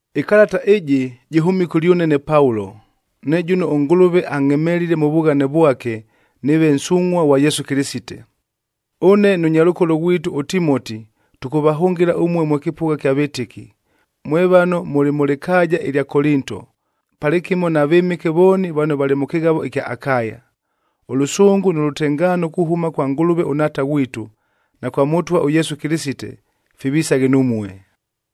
Ɨkalata ɨjɨ jɨhʉmile kʉlyʉne ne Paulo, ne jʉno ʉNgʉlʉve angʼhemelile mʉ vughane vwake nɨɨve nsungʼhua ghwa Yesu Kɨlɨsite. Ʉne nʉ nyalʉkolo ghwitu ʉTimoti tʉkʉvahʉngɨla ʉmue mwe kɨpʉgha kya vɨtɨki, mwe vano mʉlɨ mʉ lɨkaaja ɨlya Kolinto, palɨkɨmo na vɨmɨke vooni vano valɨ mʉ kɨghavo ɨkya Akaya. Ʉlʉsʉngʉ nʉ lʉtengaano kuhʉma kwa Ngʉlʉve ʉNhaata ghwitu, na kwa Mʉtwa ʉYesu Kɨlɨsite, fivisaghe numue.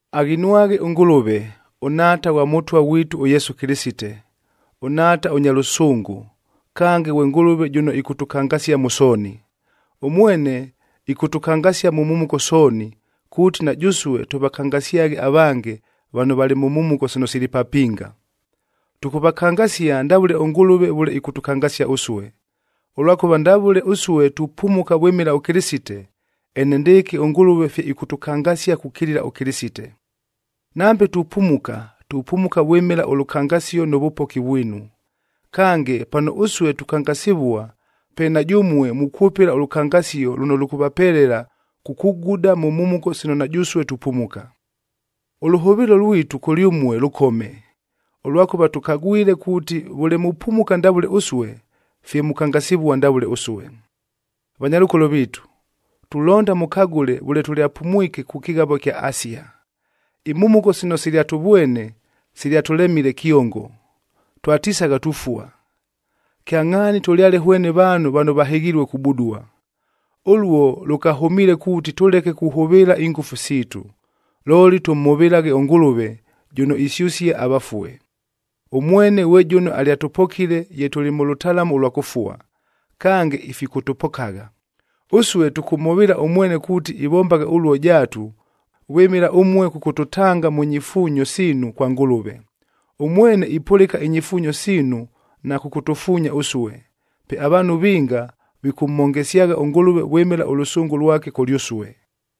Aghinwaghe ʉNgʉlʉve, ʉNhaata ghwa Mʉtwa ghwitu ʉYesu Kɨlɨsite, ʉNhaata ʉnya lʉsʉngʉ, kange ghwe Ngʉlʉve jʉno ɨkʉtʉkangasia mʉ sooni. Ʉmwene ɨkʉtʉkangasia mʉ mhumuko sooni, kuuti na jʉsue tʉvakangasyaghe avange vano valɨ mʉ mhumuko sino sili papinga. Tʉkʉvakangasia ndavʉle ʉNgʉlʉve vʉle ɨkʉtʉkangasia ʉsue. Ʉlwakʉva ndavʉle ʉsue tupumuka vwɨmɨla ʉKɨlɨsite, enendɨɨkɨ ʉNgʉlʉve fye ifikʉtʉkangasia kukilila ʉKɨlɨsite. Nambe tupumuka, tupumuka vwɨmɨla ʉlʉkangasio nʉ vʉpoki vwinu. Kange, pano ʉsue tukangasivua, pe na jʉmue mukwʉpɨla ʉlʉkangasio lʉno lʉkʉvapelela kukuguda mʉ mhumuko sino na jʉsue tupumuka. Ʉlʉhʉvɨɨlo lwitu kʉlyʉmue lʉkome, ʉlwakʉva tʉkagwile kuuti vʉle mupumuka ndavʉle ʉsue, fye mukangasivua ndavʉle ʉsue. Vanyalʉkolo viitu, tulonda mʉkagʉle vʉle tʉlyapumwike kʉ kɨghavoa ɨkya Asia. Imhumuko sino silyatʉvwene silyatʉlemile kyongo, twatisagha tufua. Kyangʼhaani tʉlyale hwene vaanhu vano vahɨghilue kubudua. Ʉluo lʉkahʉmiile kuuti tʉleke kuhʉvɨɨla ingʉfu siitu, looli tʉmhʉvɨlaghe ʉNgʉlʉve, jʉno isyʉsia avafue. Ʉmwene ghwe jʉno alyatʉpokile ye tʉlɨ mʉ lʉtalamu ʉlwa kʉfua, kange ifikʉtʉpokagha. Ʉsue tʉkʉmhʉvɨɨla ʉmwene kuuti ivombagha ʉluo jaatu, vwɨmɨla ʉmue kʉkʉtʉtanga mʉ nyifuunyo siinu kwa Ngʉlʉve. Ʉmwene ipʉlɨka inyifuunyo siinu na kʉkʉtʉfuunya ʉsue. Pe avaanhu vinga vikʉmhongesyagha ʉNgʉlʉve vwɨmɨla ʉlʉsʉngʉ lwake kʉlyʉsue.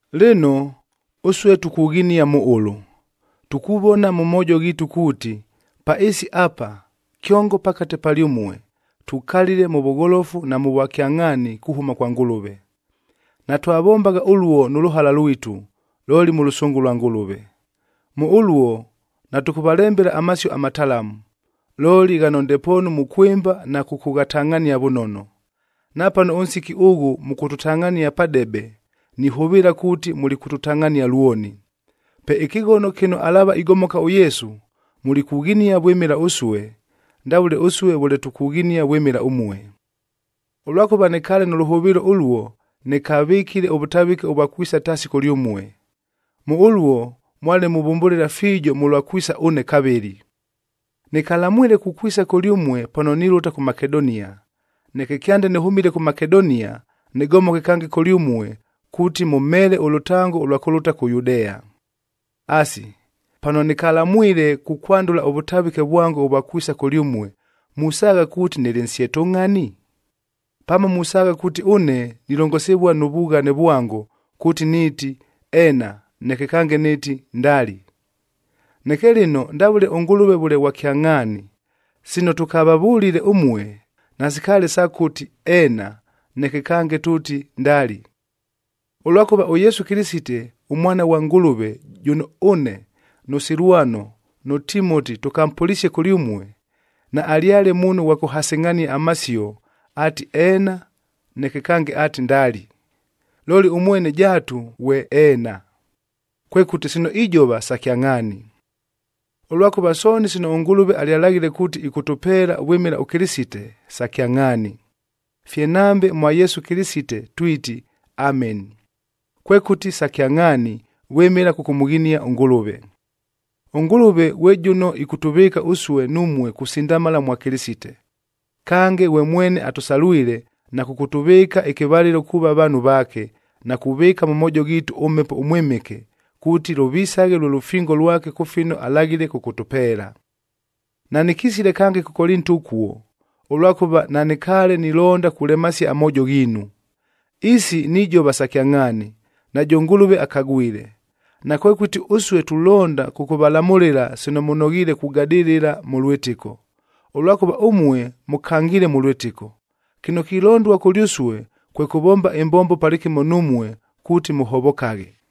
Lɨno, ʉsue tukughinia mʉ ʉlʉ: Tukuvona mʉ moojo ghiitu kuuti, pa ɨɨsi apa, kyongo pakate palyʉmue, tukalile mʉ vʉgholofu na mʉ vwakyangʼhaani kuhʉma kwa Ngʉlʉve. Natwavombagha ʉluo nʉ lʉhala lwitu, looli mʉ lʉsʉngʉ lwa Ngʉlʉve. Mʉ ʉluo natʉkʉvalembela amasio amatalamu, looli ghano ndepoonu mukwɨmba na kʉkʉghatangʼhania vʉnono. Napano ʉnsiki ʉghʉ mʉkʉtʉtangʼhania padebe, nihʉvɨɨla kuuti mulikʉtʉtangʼhania lwoni. Pe ɨkɨghono kɨno alaava igomoka ʉYesu, mulikughinia vwɨmɨla ʉsue, ndavʉle ʉsue vʉle tukughinia vwɨmɨla ʉmue. Ʉlwakʉva nɨkaale nʉ lʉhʉvɨɨlo ʉluo, nɨkavɨkile ʉvʉtavɨke ʉvwa kwisa taasi kʉlyʉmue. Mʉ ʉluo mwale muvʉmbʉlɨla fiijo mʉlwa kwisa ʉne kavɨlɨ. Nɨkalamwile kukwisa kʉlyʉmue pano nilʉta kʉ Makedonia, neke kyande nɨhʉmile kʉ Makedonia, nɨgomoke kange kʉlyʉmue kuuti mʉmheele ʉlʉtango ʉlwa kʉlʉta kʉ Yudea. Asi, pano nɨkalamwile kukwandʉla ʉvʉtavɨke vwango ʉvwa kwisa kʉlyʉmue, musaagha kuuti nɨlɨ nsyetʉngʼhani? Pamo musaagha kuuti ʉne nilongosivua nʉ vughane vwango, kuuti nɨɨti, “Eena,” neke kange nɨɨti, “Ndali.” Neke lɨno ndavʉle ʉNgʉlʉve vʉle ghwa kyangʼhaani, sino tʉkavavʉlile ʉmue, nasikaale sa kʉti, “Eena,” neke kange tʉʉti, “Ndali.” Ʉlwakʉva ʉYesu Kɨlɨsite ʉMwana ghwa Ngʉlʉve jʉno ʉne, nʉ Silwano nʉ Timoti tʉkampʉlisie kʉlyʉmue, naalyale muunhu ghwa kʉhasɨngʼhania amasio ati, “Eena,” neke kange ati, “Ndali.” Looli ʉmwene jaatu ghwe “Eena,” kwekʉti sino ijova sa kyangʼhaani. Ʉlwakʉva sooni sino ʉNgʉlʉve alyalaghile kuuti ɨkʉtʉpeela vwɨmɨla ʉKɨlɨsite, sa kyangʼhaani. Fye nambe mwa Yesu Kɨlɨsite twiti, “Ameni,” kwekʉti sa kyangʼhaani, vwɨmɨla kʉkʉmʉghinia ʉNgʉlʉve. ɄNgʉlʉve ghwe jʉno ɨkʉtʉvɨɨka ʉsue numue kusindamala mwa Kɨlɨsite. Kange, na kʉkʉtʉvɨɨka ɨkɨvalɨlo kuuva vaanhu vaake, na kuvɨɨka mʉ moojo ghiitu ʉMhepo ʉMwɨmɨke, kuuti lʉvisaghe lwe lʉfingo lwake kʉ fino alaghile kʉkʉtʉpeela. Nanɨkisile kange kʉ Kolinto ʉkuo, ʉlwakʉva nanɨkaale nilonda kulemasia amoojo ghiinu. Isi nijova sa kyangʼhaani, najʉ Ngʉlʉve akagwile. Nakwekʉti ʉsue tulonda kʉkʉvalamʉlɨla sino mʉnoghiile kugadɨlɨla mʉ lwɨtɨko, ʉlwakʉva ʉmue mʉkangiile mʉ lwɨtɨko. Kɨno kilondua kʉlyʉsue, kwe kʉvomba ɨmbombo palɨkɨmo numue kuuti mʉhovokaghe.